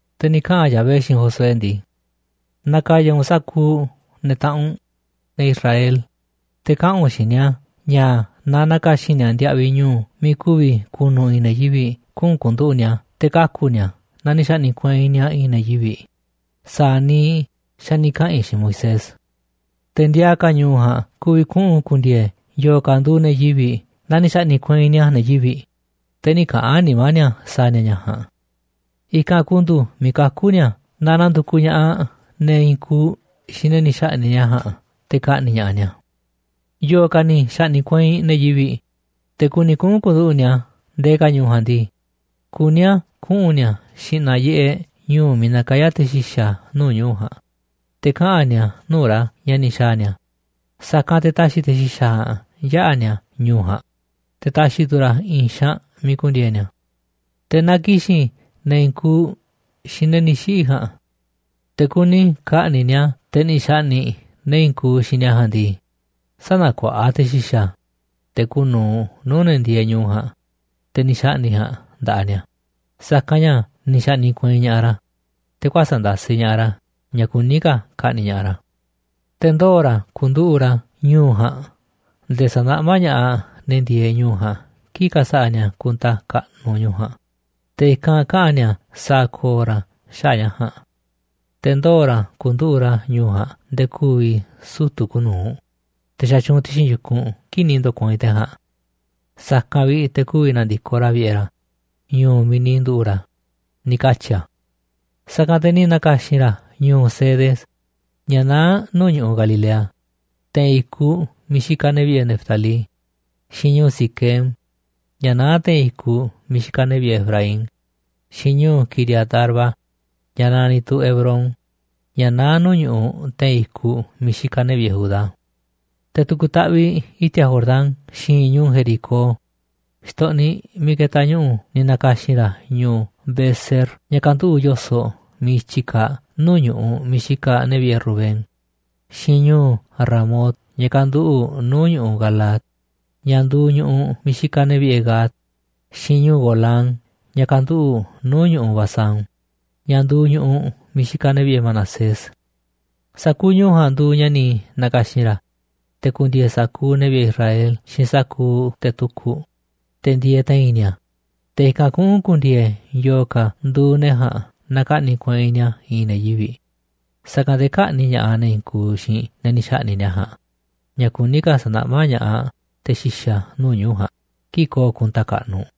Te̱ ni̱ kaꞌa̱n Yahvé xiinꞌ Josué ndii: ―Na̱ka̱ya̱ u̱nꞌ sa̱kuuꞌ ne̱ taꞌanꞌ u̱nꞌ, ne̱ Israel, te̱ kaꞌa̱n u̱nꞌ xiinꞌ ni̱a̱ ña̱ na na̱ka̱xi̱n ni̱a̱ ndiaꞌviꞌ ñu̱u̱ miiꞌ ku̱vi̱ ku̱nu̱ i̱i̱n ne̱ yivi̱ꞌ kuꞌu̱n ku̱nduꞌu̱ꞌ ni̱a̱ te̱ kaku̱ ni̱a̱ naaꞌ ni̱ xa̱ꞌni̱ꞌ kueinꞌ ni̱a̱ i̱i̱n ne̱ yivi̱, sa̱a̱ niiꞌ xa̱ ni̱ kaꞌa̱n i̱ xiinꞌ Moisés. Te̱ ndiaa ka̱ ñu̱u̱ ja̱a̱nꞌ ku̱vi̱ kuꞌu̱n ku̱ndi̱e̱e̱ yo̱o̱ ka̱ nduuꞌ ne̱ yivi̱ naaꞌ ni̱ xa̱ꞌni̱ꞌ kueinꞌ ni̱a̱ ne̱ yivi̱ꞌ, te̱ nï̱ kaꞌa̱n nimá ni̱a̱ sa̱a̱ ni̱a̱ ña̱ ja̱a̱nꞌ. I̱kanꞌ ku̱ndu̱u̱ miiꞌ kaku̱ ni̱a̱ naaꞌ na̱ndu̱kuꞌ ña̱ꞌaꞌ ne̱ i̱i̱n kuuꞌ xiinꞌ ne̱ ni̱ xa̱ꞌni̱ꞌ ni̱a̱ ja̱a̱nꞌ te̱ ka̱ꞌni̱ꞌ ña̱ꞌaꞌ ni̱a̱. ’Yo̱o̱ ka̱ ni̱ xa̱ꞌni̱ꞌ kueinꞌ ne̱ yivi̱ꞌ, te̱ kuni kuꞌu̱n ku̱nduꞌu̱ꞌ ni̱a̱ ndee ka̱ ñu̱u̱ ja̱a̱nꞌ ndii, kuní a̱ kuꞌu̱n ni̱a̱ xi̱ꞌna̱ yiꞌeꞌ ñu̱u̱ miiꞌ nakayá te̱ xi̱xa̱ nuu̱ꞌ ñu̱u̱ ja̱a̱nꞌ, te̱ kaꞌa̱n ni̱a̱ nuu̱ꞌ ra̱ ña̱ ni̱ xa̱a̱ ni̱a̱. Sa̱kanꞌ te̱ ta̱xi̱ te̱ xi̱xa̱ ja̱a̱nꞌ yaꞌa̱ ni̱a̱ ñu̱u̱ ja̱a̱nꞌ, te̱ ta̱xi̱ tu̱ ra̱ i̱i̱n xaanꞌ miiꞌ ku̱ndi̱e̱e̱ ni̱a̱. Te̱ naaꞌ ki̱xi̱n ne̱ i̱i̱n kuuꞌ xiinꞌ ne̱ ni̱ xiꞌi̱ ja̱a̱nꞌ te̱ kuni ka̱ꞌni̱ꞌ ni̱a̱ te̱ ni̱ xa̱ꞌni̱ꞌ ne̱ i̱i̱n kuuꞌ xiinꞌ ni̱a̱ ja̱a̱nꞌ ndii, sä̱na̱kuaꞌa te̱ xi̱xa̱, te̱ kuuꞌ nu̱uꞌ nuu̱ꞌ ne̱ ndieeꞌ ñu̱u̱ ja̱a̱nꞌ, te̱ ni̱ xa̱ꞌni̱ꞌ ja̱a̱nꞌ nda̱ꞌaꞌ ni̱a̱, sa̱kanꞌ ña̱ ni̱ xa̱ꞌni̱ꞌ kueinꞌ ña̱ꞌaꞌ ra̱, te̱ kuäsa̱ꞌ ndasiꞌ ña̱ꞌaꞌ ra̱ ña̱ kuní ka̱ ka̱ꞌni̱ꞌ ña̱ꞌaꞌ ra̱. Te̱ ndoo̱ ra̱ ku̱nduꞌu̱ꞌ ra̱ ñu̱u̱ ja̱a̱nꞌ nde̱e̱ sa̱naꞌmá ña̱ꞌaꞌ ne̱ ndieeꞌ ñu̱u̱ ja̱a̱nꞌ kii̱ꞌ ka̱sa̱ꞌa̱ ni̱a̱ kunta kaꞌnuꞌ ñu̱u̱ ja̱a̱nꞌ, te̱ i̱kanꞌ kaꞌa̱n ni̱a̱ sa̱a̱ ko̱o̱ ra̱ xaꞌa̱ꞌ ña̱ ja̱a̱nꞌ. Te̱ ndoo̱ ra̱ ku̱nduꞌu̱ꞌ ra̱ ñu̱u̱ ja̱a̱nꞌ nde̱e̱ ku̱vi̱ sutu̱ kuuꞌ nu̱uꞌ, te̱ xatyuunꞌ ti̱xi̱n yu̱kunꞌ kii̱ꞌ ni̱ ndo̱kueinꞌ te̱ ja̱a̱nꞌ. Sa̱kanꞌ vi̱ꞌ te̱ ku̱vi̱ na̱ndi̱koꞌ ra̱ vi̱ꞌe̱ ra̱, ñu̱u̱ miiꞌ ni̱ nduꞌu̱ꞌ ra̱ ―ni̱ katyi̱ a̱. Sa̱kanꞌ te̱ ni̱ na̱ka̱xi̱n ra̱ ñu̱u̱ Cedes, ña̱ naá nuu̱ꞌ ñu̱ꞌuꞌ Galilea, te̱i̱n i̱kuꞌ miiꞌ xikaꞌ ne̱ vi̱ꞌe̱ Neftalí, xiinꞌ ñu̱u̱ Siquem, ña̱ naá te̱i̱n i̱kuꞌ miiꞌ xikaꞌ ne̱ vi̱ꞌe̱ Efraín, xiinꞌ ñu̱u̱ Quiriat-arba, ña̱ naniꞌ tu̱ Hebrón, ña̱ naá nuu̱ꞌ ñu̱ꞌuꞌ te̱i̱n i̱kuꞌ miiꞌ xikaꞌ ne̱ vi̱ꞌe̱ Judá. Te̱ tu̱ku̱ taꞌviꞌ i̱ti̱a̱ Jordán xi̱i̱nꞌ ñu̱u̱ Jericó xtoꞌniꞌ miiꞌ ketaꞌ ñu̱ꞌu̱ ni̱ na̱ka̱xi̱n ra̱ ñu̱u̱ Beser, ña̱ kanduꞌu̱ꞌ yo̱soꞌ miiꞌ i̱tyi kaaꞌ nuu̱ꞌ ñu̱ꞌuꞌ miiꞌ xikaꞌ ne̱ vi̱ꞌe̱ Rubén, xiinꞌ ñu̱u̱ Ramot, ña̱ kanduꞌu̱ꞌ nuu̱ꞌ ñu̱ꞌuꞌ Galaad, ña̱ nduuꞌ ñu̱ꞌuꞌ miiꞌ xikaꞌ ne̱ vi̱ꞌe̱ Gad, xiinꞌ ñu̱u̱ Golán, ña̱ kanduꞌu̱ꞌ nuu̱ꞌ ñu̱ꞌuꞌ Basán, ña̱ nduuꞌ ñu̱ꞌuꞌ miiꞌ xikaꞌ ne̱ vi̱ꞌe̱ Manasés. Sa̱kuuꞌ ñu̱u̱ ja̱a̱nꞌ nduuꞌ ña̱ ni̱ na̱ka̱xi̱n ra̱, te̱ ku̱ndi̱e̱e̱ sa̱kuuꞌ ne̱ vi̱ꞌe̱ Israel xiinꞌ sa̱kuuꞌ te̱ tukuꞌ, te̱ ndieeꞌ te̱i̱n ni̱a̱, te̱ i̱kanꞌ kuꞌu̱n ku̱ndi̱e̱e̱ yo̱o̱ ka̱ nduuꞌ ne̱ ja̱a̱nꞌ naaꞌ ka̱ꞌni̱ꞌ kueinꞌ ni̱a̱ i̱i̱n ne̱ yivi̱, sa̱kanꞌ te̱ kä̱ꞌni̱ꞌ ña̱ꞌaꞌ ne̱ i̱i̱n kuuꞌ xiinꞌ ne̱ ni̱ xa̱ꞌni̱ꞌ ni̱a̱ ja̱a̱nꞌ, ña̱ kuní ka̱ sa̱naꞌmá ña̱ꞌaꞌ te̱ xi̱xa̱ nuu̱ꞌ ñu̱u̱ ja̱a̱nꞌ kii̱ꞌ ko̱o̱ kunta kaꞌnuꞌ.